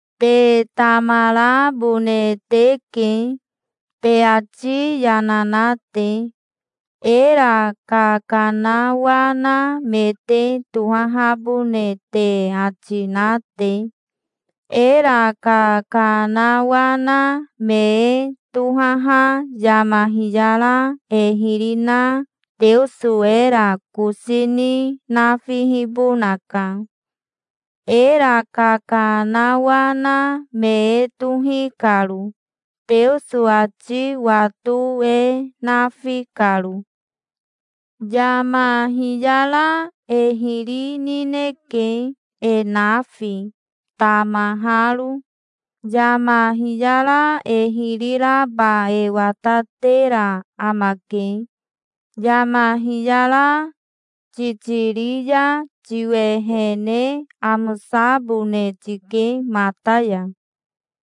Te tamarabone teke, te ati yana na te, era kakanawana me te tohahabone te ati na te. Era kakanawana me e tohaha yama hiyara e hiri na Teoso era kosi ni nafihibonaka, era kakanawana me e tohi karo, Teoso ati wato e nafi karo. Yama hiyara e hiri nineke, e nafi, tamaharo. Yama hiyara e hiri raba e watatera amake. Yama hiyara titiri ya tiwehene amosabone tike mata ya.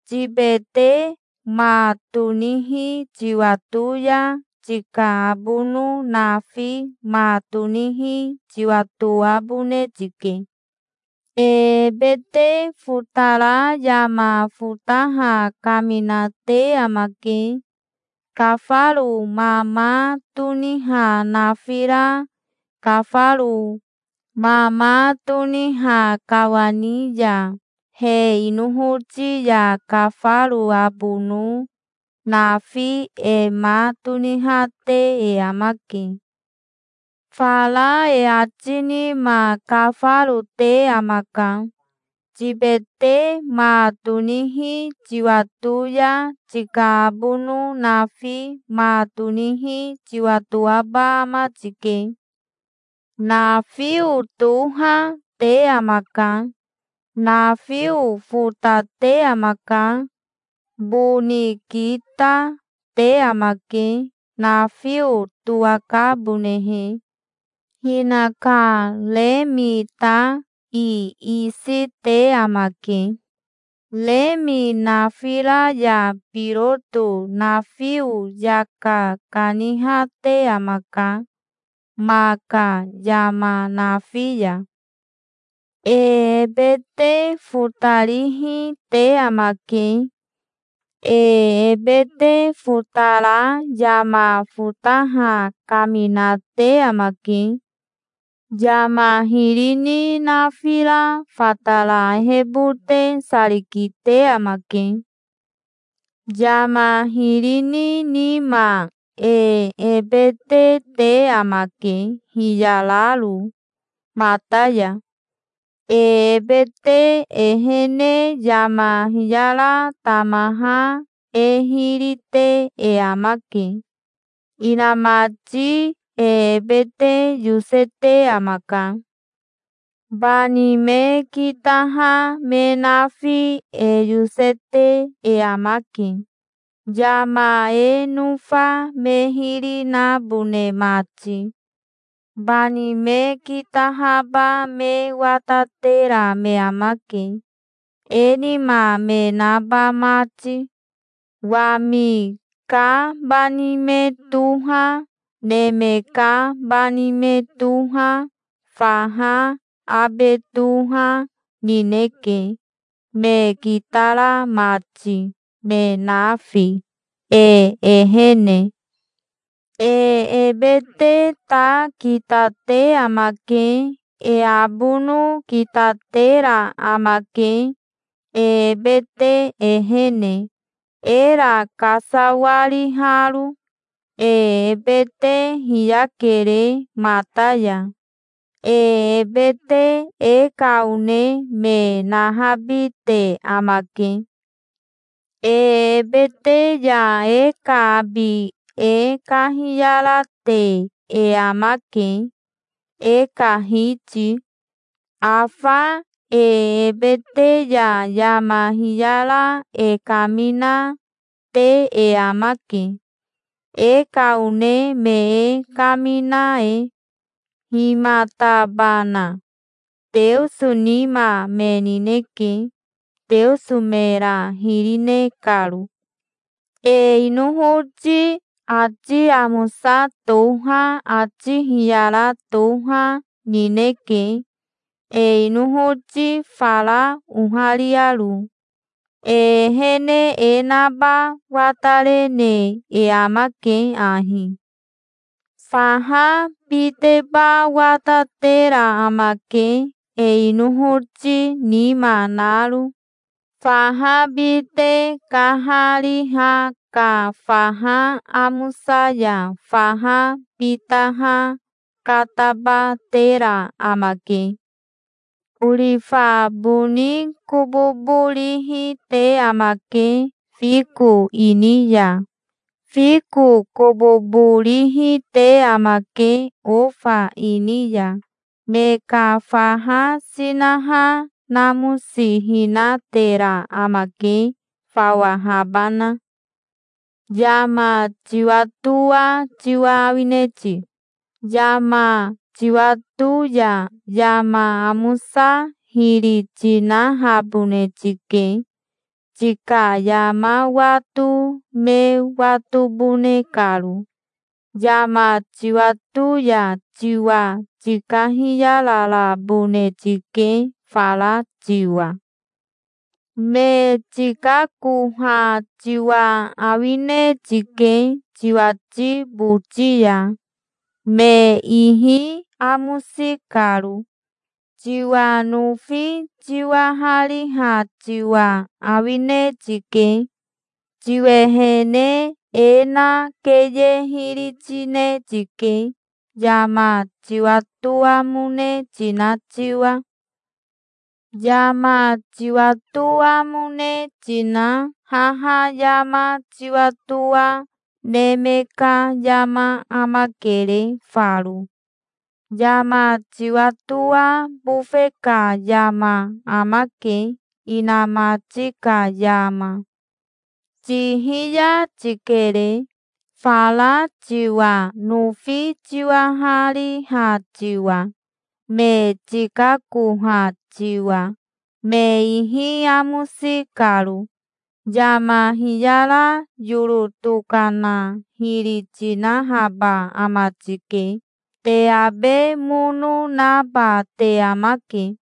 Tibete ma tonihi tiwato ya tika abono nafi ma tonihi tiwatoabone tike. E ebete fotara yama fotaha kaminate amake. Kafaro mama toniha nafira kafaro mama toniha kawani ya he inohoti ya kafaro abono nafi e ma tonihate e amake. Fara e ati nima kafaro te amaka. Tibete ma tonihi tiwato ya tika abono nafi ma tonihi tiwatoaba ama tike. Nafio toha, te amaka. Nafio fotate amaka. Boni kita, te amake, nafio towakabonehe. Hinaka remi ta iisi te amake. Remi nafira ya biroto nafio yaka kanihate amaka ma ka yama nafi ya. E ebete fotarihi te amake. E ebete fotara yama fotaha kaminate amake. Yama hiri ni nafira fatara ehebote sari kite amake. Yama hiri ni nima e ebete te amake, hiyararo mata ya. E ebete ehene yama hiyara tamaha e hiri te e amake. Inamati e ebete yosete amaka. Bani me kitaha me nafi e yosete e amake, yama e nofa me hiri nabone mati. Bani me kitahaba me watatera me amake, e nima me naba mati. Wami ka bani me toha, neme ka bani me toha, faha abe toha, nineke, me kitara mati, me nafi, e ehene. E ebete ta kitate amake. E abono kitatera amake, e ebete ehene, era kasawariharo. E ebete hiyakere mata ya. E ebete e ka one me nahabite amake. E ebete ya e ka abi e kahiyarate e amake, e ka Hiti. Afa e ebete ya yama hiyara e kamina, te e amake, e ka one me e kamina e. Himatabana? Teoso nima me nineke, Teoso mera hiri ne karo. E inohoti ati amosa toha ati hiyara toha, nineke, e inohoti fara ohariaro. E ehene e naba watarene e amake ahi. Faha biteba watatera amake e inohoti nima naro. Faha bite kahariha ka faha amosa ya faha bitaha katabatera amake. Orifa boni kobobo rihi te amake fiko ini ya. Fiko kobobo rihi te amake ofa ini ya. Ma ka faha sinaha namosihinatera amake, fawahabana. Yama tiwatoa tiwa awine ti? Yama tiwato ya yama amosa hiri tinahabone tike, tika yama wato me watobone karo. Yama tiwato ya tiwa tikahiyararabone tike fara tiwa. Me tikakoha tiwa awine tike tiwati boti ya, me ihi amosi karo. Tiwa nofi tiwahariha tiwa awine tike. Tiwehene e na keye hiri tine tike, yama tiwatoamone tina tiwa. Yama tiwatoamone tina haha yama tiwatoa neme ka yama amakere faro. Yama tiwatoa bofe ka yama amake, inamati ka yama. Tihiya tikere, fara tiwa nofi tiwahariha tiwa, me tikakoha tiwa, me ihi amosi karo. Yama hiyara yoro tokana hiri tinahaba ama tike. Te abe mono naba te amake.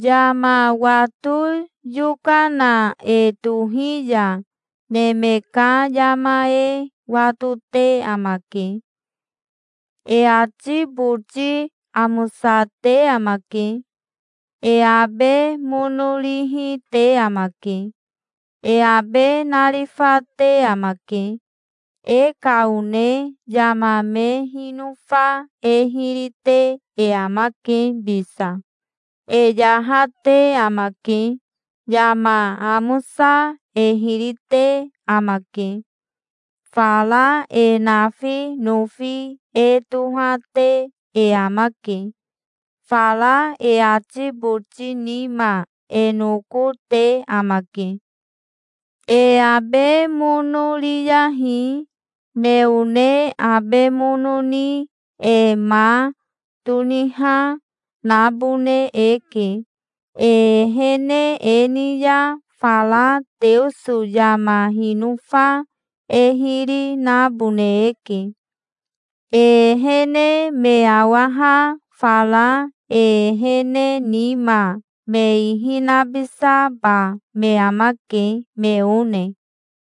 Yama wato yokana e tohi ya neme ka yama e watote amake. E ati boti amosate amake. E abe mono rihi te amake. E abe narifate amake. E ka one yama me hinofa e hiri te e amake bisa. E yahate amake. Yama amosa e hiri te amake. Fara e nafi nofi e tohate e amake. Fara e ati boti nima e noko te amake. E abe mono riyahi. Me one abe mono ni e ma toniha, nabone eke. E ehene e ni ya fara Teoso yama hinofa e hiri nabone eke. E ehene me awaha fara e ehene nima me ihi nabisaba me amake, me one.